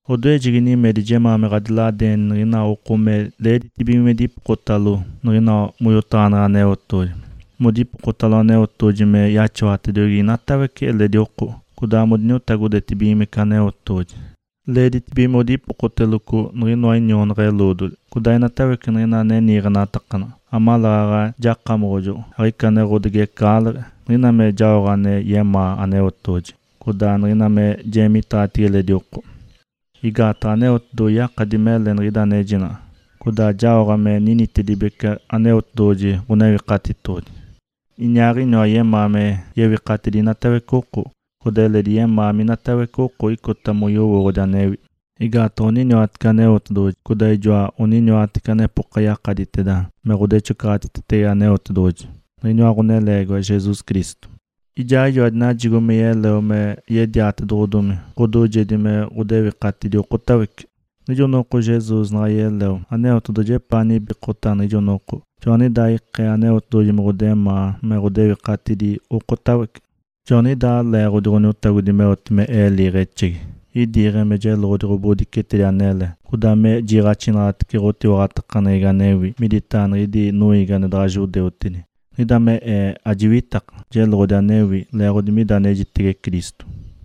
Odoejegi nimedi jemaa me ɡ̶adiladeenitece niɡ̶ina oko me leeditibige modipokotalo niɡ̶ina moyotaɡ̶aneɡ̶e Aneotedoɡ̶oji, modipokotalo Aneotedoɡ̶oji me yaxawatediogi inatawece eledi oko, codaa modiniotagodetibigimece Aneotedoɡ̶oji. Leeditibige modipokoteloco niɡ̶inoa inionaɡ̶a-eloodoli, codaa inatawece niɡ̶ina ane niiɡ̶enatakanaɡ̶a, amaleeɡ̶aɡ̶a jakamoɡ̶ojoɡ̶o, aɡ̶ica ane ɡ̶odigecaɡ̶aleɡ̶e, niɡ̶ina me jaoɡ̶a ane yemaa Aneotedoɡ̶oji, codaa niɡ̶ina me jeemiteeɡ̶atibige eledi oko. Igaataɡ̶a Aneotedoɡ̶oji yakadi mele nigidaaɡ̶ejinaɡ̶a, codaa jaoɡ̶a me ninitedibece Aneotedoɡ̶oji Ǥonewikatitoɡ̶odi. Iniaaɡ̶iniwa yemaa me yewikatidi inatawece oko. Codaa eledi yemaa minatawece oko icota moyowooɡ̶odi anewi. Igaataɡ̶a oniniwatece Aneotedoɡ̶oji, codaa ijoa onijoatece anepoka yakaditeda me ɡ̶odatecoɡ̶oteetetege Aneotedoɡ̶oji, niɡ̶iniwa Ǥoneleegiwa, Jesus Cristo. Ijaaɡ̶ijoa dinajigo me yeleo me yediatedoɡ̶odomi ɡ̶odoojedi me ɡ̶odewikatidi okotawece. Niɡ̶ijo noko Jesus naɡ̶a yeleo Aneotedoɡ̶oji epaa nibikota niɡ̶ijo noko, joaniɡ̶idaa ikee Aneotedoɡ̶oji me yemaa me ɡ̶odewikatidi okotawece. Joaniɡ̶idaa leeɡ̶odi Ǥoniotagodi meote me ee liiɡ̶exegi. Idiiɡ̶e me jeloɡ̶odi ɡ̶obodicetedi anele, codaa me jiiɡ̶axinaɡ̶atece ɡ̶otiwaɡ̶atakaneɡ̶egi anewi miditaɡ̶a niɡ̶idi noiigi ane daɡ̶a judeutedi. Niɡ̶ida me ee ajiwitaka, jeloɡ̶odi anewi, leeɡ̶odi mida anejitege Cristo.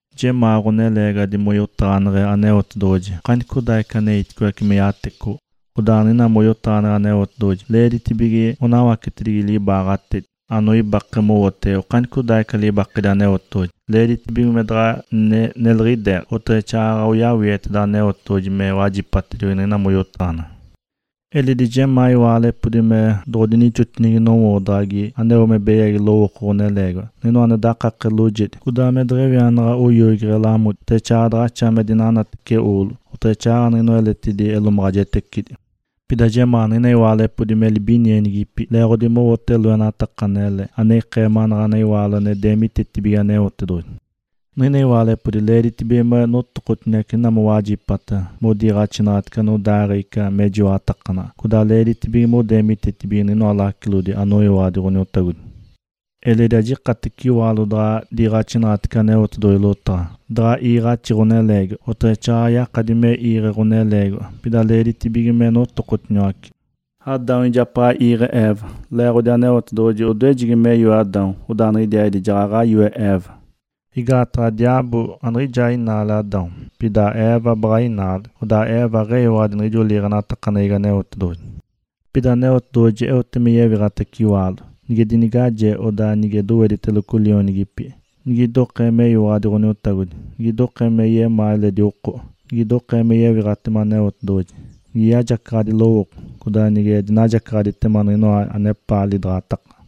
Jemaa ɡ̶oneleegiwadi moyotaɡ̶aneɡ̶e Aneotedoɡ̶oji okanicodaaɡ̶ica aneitice me yatecoɡ̶o. Odaa niɡ̶ina moyotaɡ̶aneɡ̶e Aneotedoɡ̶oji leeditibige monawacetibige libaaɡ̶atedi, anoibake mowote inokinoateda libaketedi Aneotedoɡ̶oji. Leeditibige me daɡ̶a neliɡ̶ideeɡ̶a, oteɡ̶exaaɡ̶aɡ̶a oyawieteda Aneotedoɡ̶oji me wajipatediogi niɡ̶ina moyotaɡ̶aneɡ̶e. Eledi jemaa iwaalepodi me doɡ̶odinixotinigi nowoodaɡ̶agi aneo me beyagi lowooko ɡ̶oneleegiwadi, niɡ̶inoa ane dakake loojedi, codaa me deɡ̶ewianaɡ̶a oyoigeɡ̶e lamodi, oteɡ̶exaaɡ̶aɡ̶a daɡ̶axa me dinanatece oolo, oteɡ̶exaaɡ̶aɡ̶a niɡ̶inoa eletidi elomaɡ̶ajetecidi. Pida jemaa niɡ̶ina iwaalepodi me libinienigipi leeɡ̶odi mowote loenataka anele, ane ikee manaɡ̶ana iwaalo ane deemitetibige Aneotedoɡ̶oji. Niɡ̶ina iwaalepodi leeditibige me notokotiniwace niɡ̶ina mowajipata modiniiɡ̶axitece anodaaɡ̶ee ica mejiwaɡ̶atakanaɡ̶a, codaa leeditibige modeemitetibige niɡ̶inoa lacilodi anoyiwaɡ̶adi Ǥoniotagodi. Eledi ajikatece iwaalo daɡ̶a diiɡ̶axinaɡ̶atece Aneotedoɡ̶oji lotaɡ̶a, daɡ̶a iiɡ̶axi ɡ̶oneleegiwadi, oteɡ̶exaaɡ̶aɡ̶a yakadi me iiɡ̶e ɡ̶oneleegiwadi. Pida leeditibige me notokotiniwace. Adão ijapaɡ̶a iiɡ̶e Eva, leeɡ̶odi Aneotedoɡ̶oji odoejegi me yoe Adão, odaa niɡ̶idiaaɡ̶idi jaɡ̶aɡ̶a yoe Eva. Igaataɡ̶a diaabo aniɡ̶ijaa inaale Adão, pida Eva baɡ̶a inaale, odaa Eva aɡ̶eyiwaɡ̶adi niɡ̶ijo liiɡ̶enatakaneɡ̶egi Aneotedoɡ̶oji. Pida Aneotedoɡ̶oji eote me yewiɡ̶atace iwaalo, nige dinigaje, codaa nige dowediteloco lionigipi, nigidokee meyiwaɡ̶adi Ǥoniotagodi, nigidokee me yemaa eledi oko, nigidokee me yewiɡ̶atema Aneotedoɡ̶oji, nige yajacaɡ̶adi lowooko, codaa nige dinajacaɡ̶aditema niɡ̶inoa anepaa lidaɡ̶ataka.